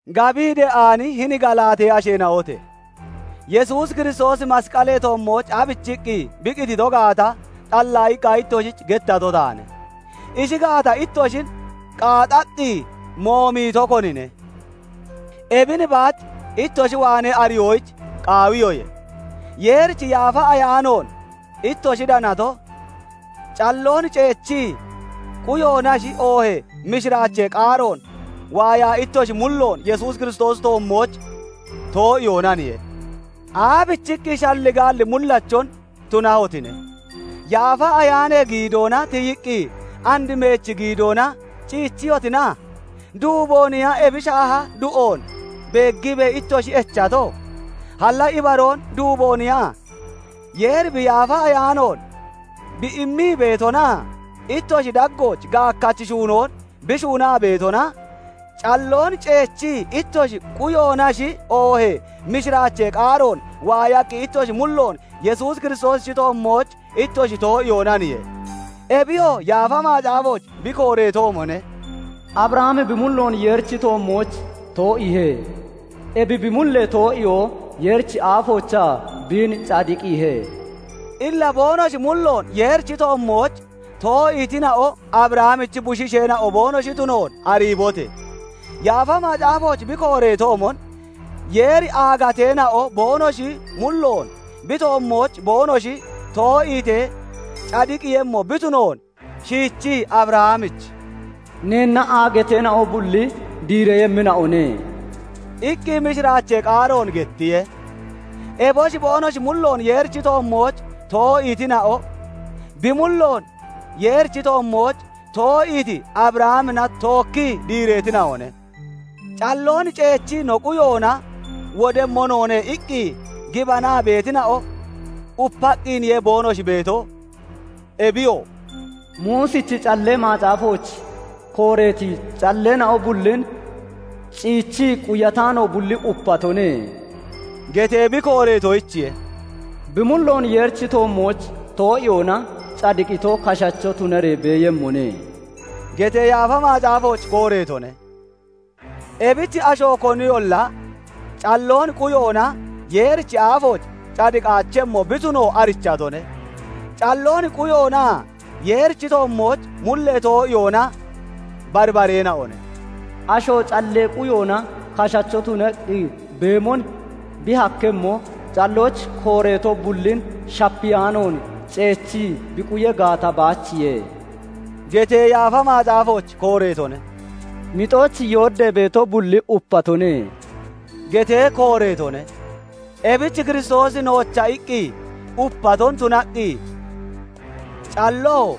Gabii de'aani hini Galaatee asheena'ote! Yesuus Kiristoosi masqalee toommooch aabichiqqi bi qitito gaata xallaayiqqa ittoshich gettato taane; ishi gaata ittoshin qaaxaqqi moomito konine? Ebin baach ittoshi waanee ariyoyich qaawiyoye; Yeerichi Yaafa Ayaanoon ittoshi danato, calloon ceechii quyoonashi oohee mishiraachee qaaroon waayaa ittoshi mulloon Yesuus Kiristoosichi toommooch too'iyoonaniye? Aabichiqqi shalligaalli mullachon tunahotine? Yaafa Ayaanee giidoona tiyiqqi and meechi giidoona ciichiyotina? Duubooniya ebi shaaha du'oon beeggiibee ittoshi echato? Halla ibaroon duubooniya? Yeeri bi Yaafa Ayaanoon bi immii beetonaa ittoshi daggooch gaakkachi shuunoon bi shuunaa beetona, calloon ceechii ittoshi quyoonashi oohee mishiraachee qaaroon waayaqqi ittoshi mulloon Yesuus Kiristoosichi toommooch ittoshi too'iyoonaniye? Ebiyoo Yaafa Macaafooch bi kooreetoomone; Abrahami bi mulloon Yeerichi toommooch too'iihe; ebi bi mullee too'iyoo Yeerichi aafoochaa biin cadiqiihe. Illa boonoshi mulloon Yeerichi toommooch to'iitina'o Abrahamichi bushiisheena'o boonoshi tunoon ariibote! Yaafa Macaafooch bi kooreetoomon, Yeeri aagateena'o boonoshi mulloon bi toommooch boonoshi too'iitee cadiqiiyemmo bi tunoon shiichii Abrahamich "Neenna aagateena'o bulli diireeyemmina'one" iqqi mishiraachee qaaroon gettiye. Eboshi boonoshi mulloon Yeerichi toommooch too'iitina'o, bi mulloon Yeerichi toommooch too'iiti Abrahamina tookkii diireetina'one. "Calloon ceechii no quyoona wodemmo noone" iqqi gibanaa beetina'o upaqqiniye boonoshi beeto; Ebiyoo, "Muusichi Callee Macaafooch kooreeti calleena'o bullin ciichii quyataano bulli upatone" getee bi kooreetoyichiye. "Bi mulloon Yeerichi toommooch too'iyoona cadiqito kashacho tunaree beeyemmone" getee Yaafa Macaafooch kooreetone; ebich asho koniyolla calloon quyoona Yeerichi aafooch cadiqaachemmo bi tuno arichatone. Calloon quyoonaa Yeerichi toommooch mullee too'iyoona barbareena'one. "Asho callee quyoona kashacho tunaqqi beemon bi hakkemmo, callooch kooreeto bullin shapiyaanoon ceechii bi quya gaata baachiye" getee Yaafa Macaafooch kooreetone. "Mixooch yooddee beeto bulli upatone" getee kooreetone; ebich Kiristoosi noocha iqqi upaton tunaqqi calloo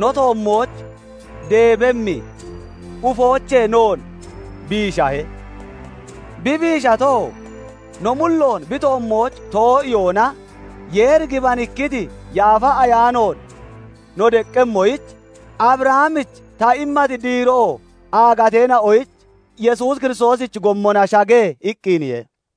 no toommooch deebemmi ufoochee noon biishahe. Bi biishato, no mulloon bi toommooch too'iyoona Yeeri gibanikkiti Yaafa Ayaanoon no deqqemmoyich, "Abrahamich ta immati diiroo aagateena'oyich Yesuus Kiristoosichi gommona shage" iqqiniye.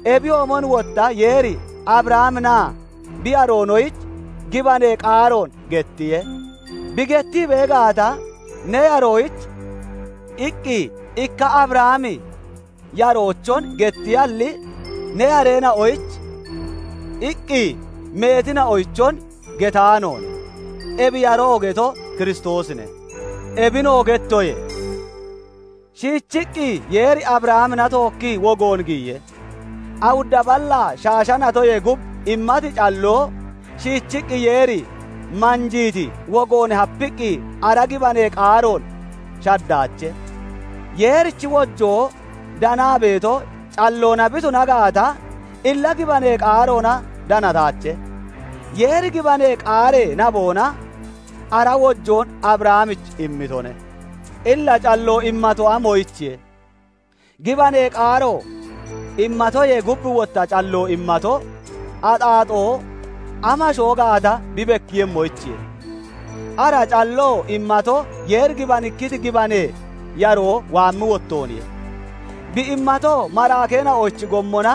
Ebiyoomon wotta Yeeri Abrahaminaa bi yaroonoyich gibanee qaaroon gettiye; bi gettii bee gaata, "Ne yaroyich" iqqi ikka Abrahami yaroochon gettiyalli, "Ne yareena'oyich" iqqi meetina'oyichon getaanoone; ebi yaroo getoo Kiristoosine. Ebinoo gettoye; shiichiqqi Yeeri Abrahamina tookkii wogoon giyiye; awudda ballaa shaasha natoyee gub immati calloo, shiichiqqi Yeeri manjiiti wogoon hapiqqi ara gibanee qaaroon shaddaache. Yeerichi wojoo danaa beeto calloona bi tuna gaata, illa gibanee qaaroona danataache; Yeeri gibanee qaaree naboona ara wojoon Abrahamich immitone. Illa calloo immato, amoyichiye? Gibanee qaaro immatoyee gub wotta calloo immato, axaaxoo amashoo gaata bi bekkemmoyichiye. Ara calloo immato Yeeri gibanikkiti gibanee yaroo waammi wottooniye. Bi immatoo maraakeena'ochi gommona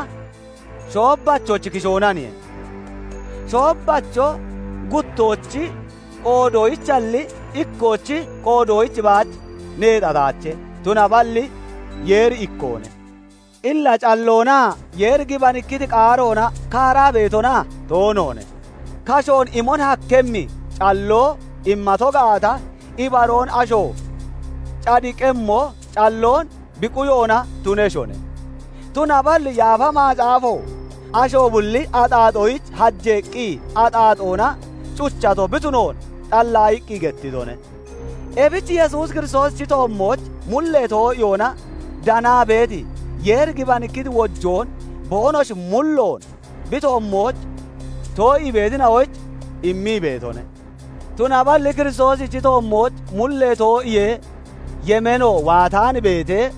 shoobbachochi kishoonaniye. Shoobbacho guttoochi qoodoyichalli, ikkoochi qoodoyich baach neexataache; tunaballi Yeeri ikkoone. Illa calloonaa Yeeri gibanikkiti qaaroona kaaraa beetona? Toonoone. Kashoon imon hakkemmi calloo immato gaata, ibaroon asho cadiqemmo calloon bi quyoona tuneshone; tunaballi Yaafa Macaafo asho bulli axaaxoyich hajeeqqi axaaxoona cuchato bi tunoon xallaayiqqi gettitone. Ebich Yesuus Kiristoosichi toommooch mullee too'iyoona danaa beeti, Yeeri gibanikkiti wojoon boonoshi mulloon bi toommooch too'ii beetina'oyich immii beetone. Tunaballi Kiristoosichi toommooch mullee too'iyee yemeeno waataan beetee,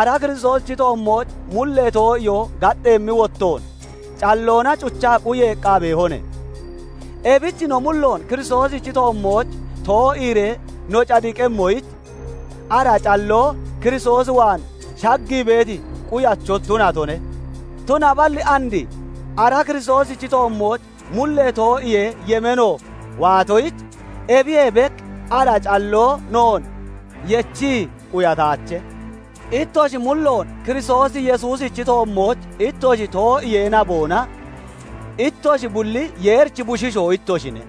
ara Kiristoosichi toommooch mullee too'iyoo gaxxeemmi wottoon, calloona cuchaa quyeeqqa beehone. Ebich no mulloon Kiristoosichi toommooch too'iiree no cadiqemmoyich, ara calloo Kiristoos waan shaggii beeti quyacho tunatone. Tunaballi and ara Kiristoosichi toommooch mullee too'iyee yemeeno waatoyich, ebiyee bek ara calloo noon yechii quyataache. Ittoshi mulloon Kiristoos Yesuusichi toommooch ittoshi too'iyee naboona ittoshi bulli Yeerichi bushiishoo ittoshine;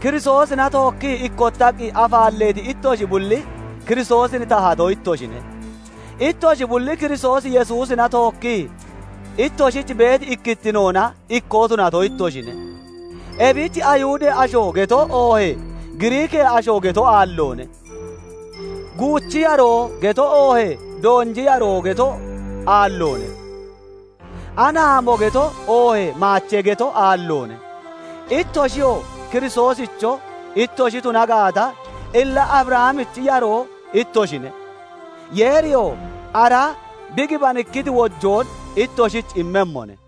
Kiristoosina tookkii ikkottaqqi afaalleeti ittoshi bulli Kiristoosin tahato ittoshine; Ittoshi bulli Kiristoos Yesuusina tookkii ittoshich beeti ikkittinoona ikkoo tunato ittoshine. Ebich Ayihudee asho geto oohee Giriikee asho geto aalloone; guuchi yaroo geto oohee doonji yaroo geto aalloone; anaamo geto oohee maachee geto aalloone. Ittoshiyoo Kiristoosicho ittoshi tuna gaata, illa Abrahamichi yaroo ittoshine; Yeeriyoo ara bi gibanikkiti wojoon ittoshich immemmone.